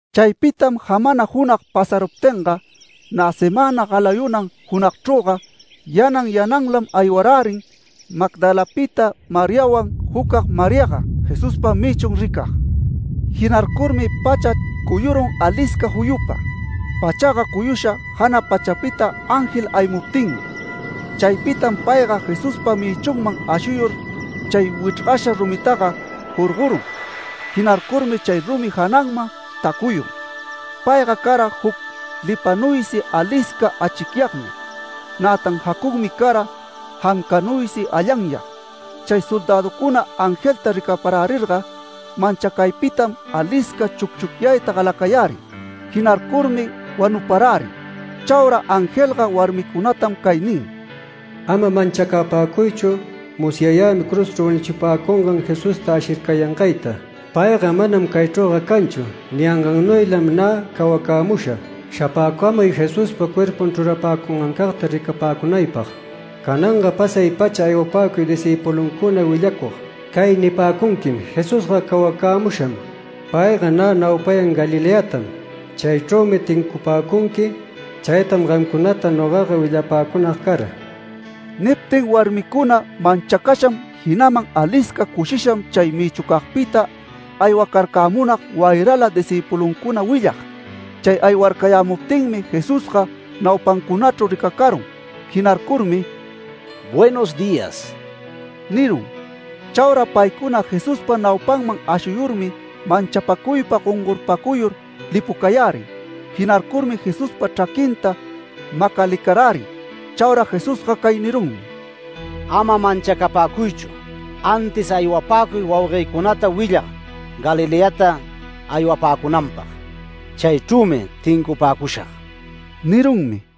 Chaypitam jamana junag pasaruptinga, nä semäna galayunan junagchrüga yanan yananlam aywarärin Magdalapita Mariawan jucag Mariaga Jesuspa mïchun ricag. Jinarcurmi pacha cuyurun alisca juyupa. Pachaga cuyusha jana pachapita ángel aymuptinmi. Chaypitam payga Jesuspa mïchunman ashuyur chay wichrgasha rumitaga jorgorun. Jinarcurmi chay rumi jananman tacuyun. Payga cara juc lipanuysi alisca achicyagmi. Nätan jacunmi cara jancanuysi allanyag. Chay soldäducuna angelta ricaparärirga manchacaypitam alisca chucchucyayta galacayärin. Jinarcurmi wanuparärin. Chaura angelga warmicunatam cay nin: “Ama manchacapäcuychu. Musyayämi cruzchru wanuchipäcungan Jesusta ashircayangayta. Payga manam caychrüga canchu. Ningannuylam nä cawacämusha. Shapäcamuy Jesuspa cuerpun chrurapäcungancagta ricapäcunaypag. Cananga pasay-pacha aywapäcuy discïpuluncuna willacug, cay nipäcunquim: ‘Jesusga cawacämusham. Payga nä naupayan Galileatam. Chaychrümi tincupäcunqui’. Chaytam gamcunata nogaga willapäcunag cara”. Niptin warmicuna manchacasham jinaman alisca cushisham chay mïchucagpita aywacarcamunag wayrala discïpuluncuna willag. Chay aywarcayämuptinmi Jesusga naupancunachru ricacarun. Jinarcurmi “Buenos días” nirun. Chaura paycuna Jesuspa naupanman ashuyurmi manchapacuypa gongorpacuyur lipucayärin. Jinarcurmi Jesuspa chraquinta macalicarärin. Chaura Jesusga cay nirunmi: “Ama manchacapäcuychu, antis aywapäcuy wauguëcunata willag Galileata aywapäcunanpag. Chaychrümi tincupäcushag” nirunmi.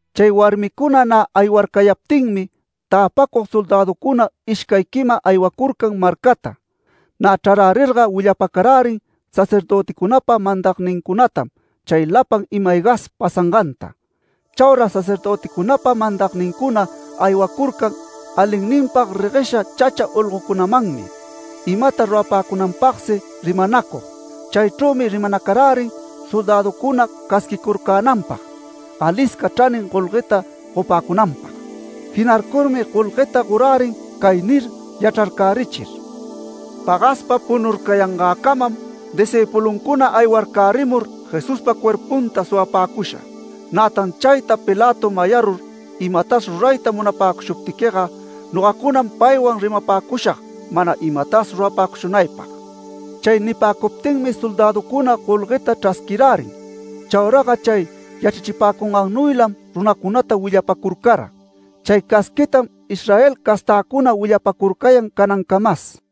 Chay warmicuna nä aywarcayaptinmi täpacug soldäducuna ishcay quima aywacurcan marcata. Nä chrarärirga willapacarärin sacerdöticunapa mandagnincunatam chay lapan ima-aygas pasanganta. Chaura sacerdöticunapa mandagnincuna aywacurcan alinninpag reguesha chacha olgocunamanmi imata rurapäcunanpagsi rimanacug. Chaychrümi rimanacarärin soldäducuna casquicurcänanpag alisca chranin golgueta gopäcunanpag. Jinarcurmi golgueta gorärin cay nir yachrarcärichir: “ ‘Pagaspa punurcayangäcamam, discïpuluncuna aywarcärimur Jesuspa cuerpunta suwapäcusha’. Nätan chayta Pilato mayarur imatas rurayta munapäcushuptiquiga, nogacunam paywan rimapäcushag mana imatas rurapäcushunaypag”. Chay nipäcuptinmi soldäducuna golgueta chrasquirärin. Chauraga chay yachrachipäcungannuylam runacunata willapacurcara. Chay casquitam Israel castäcuna willapacurcayan canancamas.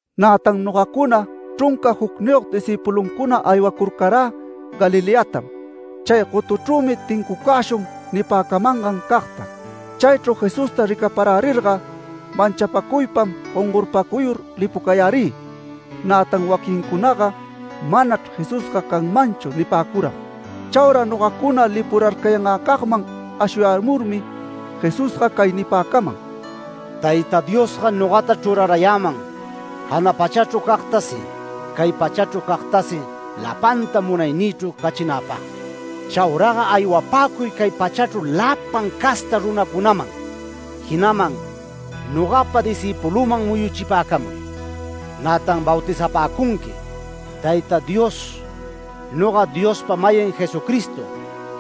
Nätan nogacuna chrunca jucniyog discïpuluncuna aywacurcarä Galileatam “Chay gotuchrümi tincucäshun” nipäcamangan cagta. Chaychru Jesusta ricaparärirga manchapäcuypam gongorpacuyur lipucayärï. Nätan waquinnïcunaga “Manachr Jesusga canmanchu” nipäcuram. Chaura nogacuna lipurarcayangäcagman ashuyamurmi Jesús cay nipäcaman: “Tayta Diosga nogata chrurarayäman jana pachachru cagtasi cay pachachru cagtasi lapanta munaynïchru cachinäpagmi. Chauraga aywapäcuy cay pachachru lapan casta runacunaman jinaman nogapa discïpulüman muyuchipäcamuy. Nätan bautizapäcunqui ‘Tayta Dios, noga Diospa-mayin Jesucristo,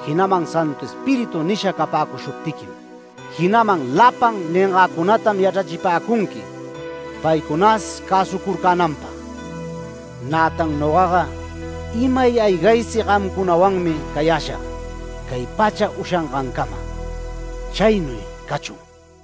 jinaman Santu Espíritu nisha capäcushuptiquim’. Jinaman lapan ningäcunatam yachrachipäcunqui paycunas cäsucurcänanpag. Nätan nogaga imay aygaysi gamcunawanmi cayäshag cay pacha ushangancama”. Chaynuy cachun.